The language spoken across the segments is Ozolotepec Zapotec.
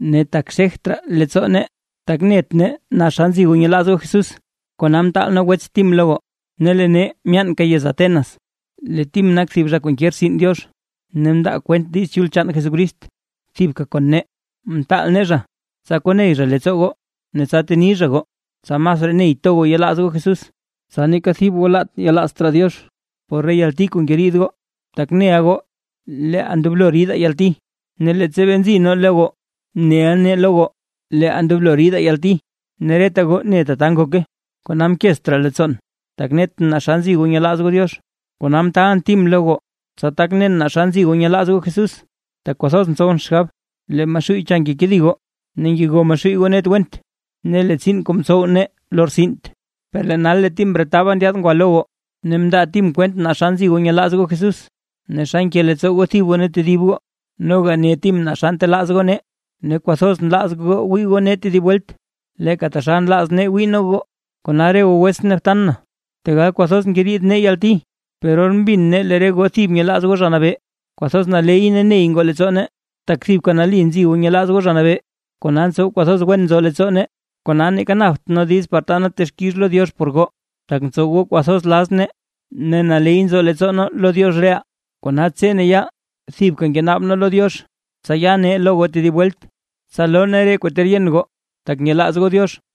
Ne tak xegt raa leettsoo nee, tak net nee naa xa nzi goo nyelaaz goo Jesús, kona mtaal nee wets Tim lo goo, ne lee nee myaanka yez Atenas. Lee Tim nak thib zha kuu nke rtsin Diox, ne ndaa kwent Diiz Chul chaan Jesucrist thibka kon nee, mtaal nee zha, tsa koney zha leettsoo goo ne tsa teni zha goo, tsa masraa ney to goo yelaaz goo Jesús, tsa neeka thib goo laat yelaazt raa Diox por re yalti kuu ngeriid goo. Tak neʼa goo leeʼaa ndoblo ridaa yalti. Ne leettsa bee nzi nee lo goo neʼa nee lo goo, leeʼaa ndoblo ridaa yalti ne reta goo ne tata ngoke. Kona mkezt raa leettsoon, tak netʼn naa xa nzi goo nyelaaz goo Diox, kona mtaalʼn Tim lo goo, tsa tak nen xa nzi goo nyelaaz goo Jesús, tak kwathoz ntsowʼn xgab, lee Maxuuy cha ngekedi goo ne ngego Maxuuy goo net went ne lee tsiin kuu mtsow nee lortsint. Per lee nal lee Tim mretaba ndyaad ngwa lo goo, ne mndaa Tim kwent naa xa nzi goo nyelaaz goo Jesús ne xa nke leettsoo goo thib goo ne tedib goo. Noga ne Tim naa xa ntelaaz goo nee, ne kwathoz nlaaz goo wii goo nee tedib welt, leeka taxal nlaaz nee wii nee goo. Kona re goo wetsʼn ne btan na, tegal kwathoz ngeriid nee yalti, per or mbin nee lee re goo thib nyelaaz goo Zha Nabee, kwathoz naley ne ney ngoo leettsoo nee. Tak thibka nali nzi goo nyelaaz goo Zha Nabee, kona ntsow kwathoz wen nzo leettsoo nee. Kona, neeka napt nee diiz par taa nee texkix lo Diox por goo, tak ntsow goo kwathoz laz nee ne naley nzo leettsoo nee lo Diox reʼaa. Kona tse ne yaal thibka ngenaab nee lo Diox, tsa ya nee lo goo tedib welt, tsa loo nee re kuu ter yen goo tak nyelaaz goo Diox.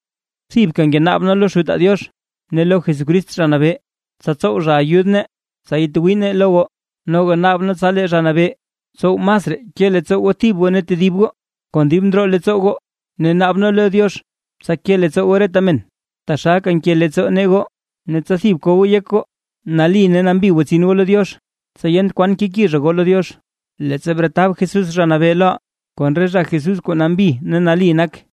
Thibka ngenaab nee lo Xutaa Diox, ne lo Jesucrist Zha Nabee, tsa tsow zha ayud nee tsa yatwii nee lo goo. Noga naab nee tsa lee Zha Nabee tsow masraa ke leettsoo goo thib goo ne tedib goo, kon dib ndroo leettsoo goo ne naab nee lo Diox tsa ke leettsoo goo reta men, taxalka nke leettsoo nee goo. Ne tsa thib ko goo yek goo nali ne nambi gwatsin goo lo Diox, tsa yent kwan keki zha goo lo Diox, leettsa bretab Jesús Zha Nabee loʼaa, kon re zha Jesús kuu nambi ne nali nak.